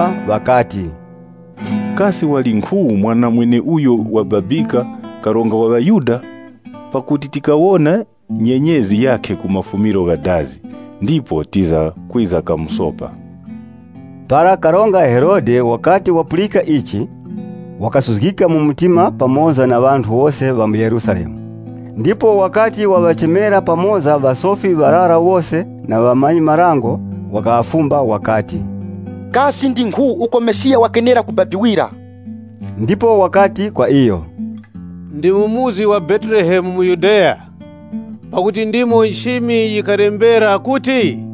Ŵakafumba ŵakati, “Kasi walinkhu mweneuyo wababika karonga wa ŵaYuda? Pakuti tikawona nyenyezi yakhe ku mafumiro gha dazi, ndipo tiza kwiza kamusopa.” Para Karonga Herode wakati wapulika ichi, wakasuzgika mu mtima pamoza na ŵanthu wose ŵa mu Yerusalemu. Ndipo wakati waŵachemera pamoza ŵasofi ŵarara wose na ŵamanyi-marango wakaŵafumba wakati, “Kasi ndi nkhu uko Mesiya wakenera kubabikira.” Ndipo ŵakati kwa iyo, “Ndi mu muzi wa Betelehemu mu Yudeya. Pakuti ndimo nchimi yikalembera kuti,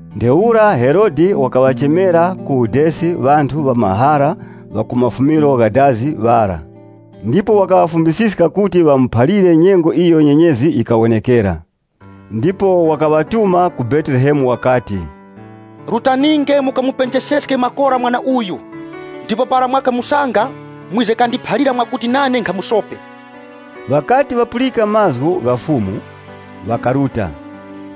Ntheura Herode wakaŵachemera ku udesi ŵanthu ŵamahara ŵa ku mafumiro gha dazi, ndipo wakaŵafumbisiska kuti ŵamuphalire nyengo iyo nyenyezi yikawonekera. Ndipo wakaŵatuma ku Betelehemu wakati, “Rutaninge mukamupenjeseske makora mwana uyu, ndipo para mwakamusanga, mwize kandiphalire mwakuti nane nkhamusope.” Ŵakati ŵapulika mazgu gha karonga, iwo ŵakaruta.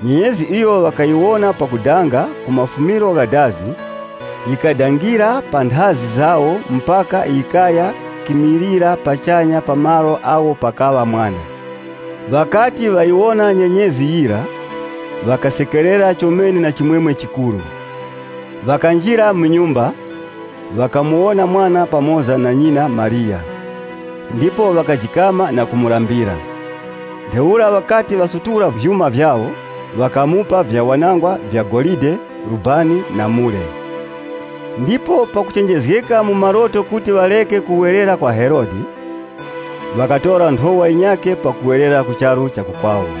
Nyenyezi iyo ŵakayiwona pakudanga ku mafumiro gha dazi, yikadangira panthazi pawo mpaka yikaya kimilira pachanya pa malo agho pakaŵa mwana. Ŵakati ŵayiwona nyenyezi yira, ŵakasekerera chomene na chimwemwe chikuru. Ŵakanjira mu nyumba, ŵakamuwona mwana pamoza na nyina Mariya, ndipo ŵakajikama na kumulambira. Ntheura ŵakati ŵasutula vyuma vyawo ŵakamupa vyawanangwa vya golide, vyakununkhira, na mure. Ndipo pakuchenjezgeka mu maloto kuti ŵareke kuwerera kwa Herode, ŵakatora nthowa yinyakhe pakuwerera ku charu cha ku kwawo.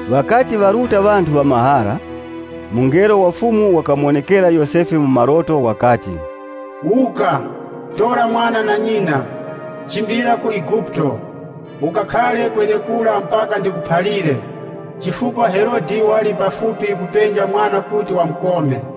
Ŵakati ŵaruta ŵanthu ŵamahara, mungelo wa Fumu wakamuwonekera Yosefe mu maloto wakati, “Wuka, tora mwana na nyina, chimbilira ku Eguputo. Ukakhare kwenekura mpaka ndikuphalire, chifukwa Herode wali pafupi kupenja mwana kuti wamukome.”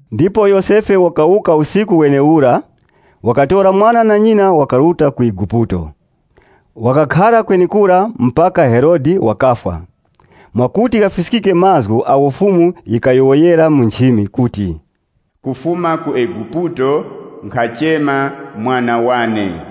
Ndipo Yosefe wakawuka usiku wenewura, wakatora mwana na nyina wakaruta ku Eguputo. Wakakhara kwenekura mpaka Herode wakafwa, mwakuti ghafiskike mazgu agho Fumu yikayowoyera mu nchimi kuti, “Kufuma ku Eguputo nkhachema mwana wane.”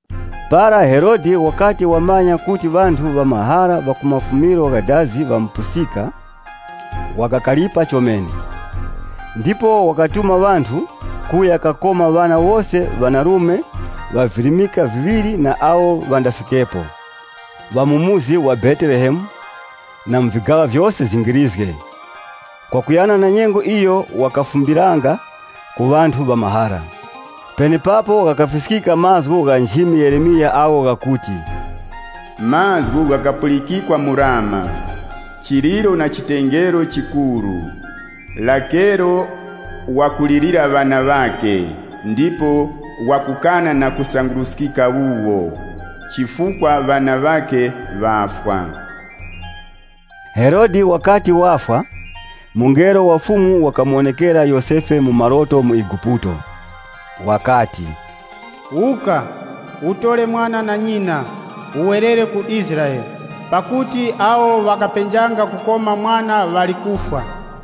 Para Herode wakati wamanya kuti ŵanthu ŵamahara ŵa ku mafumiro gha dazi ŵamupusika, wakakaripa chomene. Ndipo wakatuma ŵanthu kuya kakoma ŵana wose ŵanarume ŵa virimika viŵiri na awo ŵandafikepo, ŵa mu muzi wa Betelehemu na mu vigaŵa vyose zingirizge, kwakuyana na nyengo iyo wakafumbiranga ku ŵanthu ŵamahara. Penepapo ghakafiskika mazgu gha nchimi Yeremiya agho ghakuti, “Mazgu ghakapulikikwa mu Rama, chiliro na chitengero chikuru. Rakelo wakulirira ŵana ŵakhe. Iyo wakukana na kusanguruskika wuwo, pakuti ŵalikoso chara.” Herode wakati wafwa, mungelo wa Fumu wakamuwonekera Yosefe mu maloto mu Eguputo. Wakati, “Wuka, utore mwana na nyina, uwerere ku Israele. Pakuti awo ŵakapenjanga kukoma mwana ŵali kufwa.”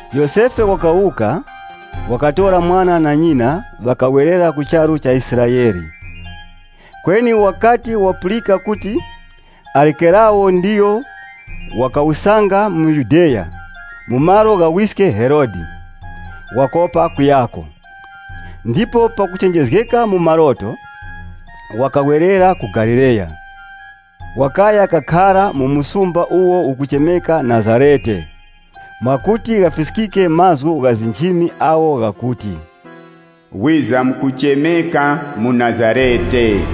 Yosefe wakawuka, wakatora mwana na nyina, ŵakawerera ku charu cha Israele. Kweni wakati wapulika kuti Arikelawu ndiyo wakawusanga mu Yudeya mu malo gha wiske Herode, wakopa kuyako. Ndipo pakuchenjezgeka mu maloto, wakawerera ku Galileya. Wakaya kakhara mu msumba uwo ukachemeka Nazarete, mwakuti ghafiskike mazgu gha nchimi agho ghakuti, “Wizamkuchemeka muNazarete.”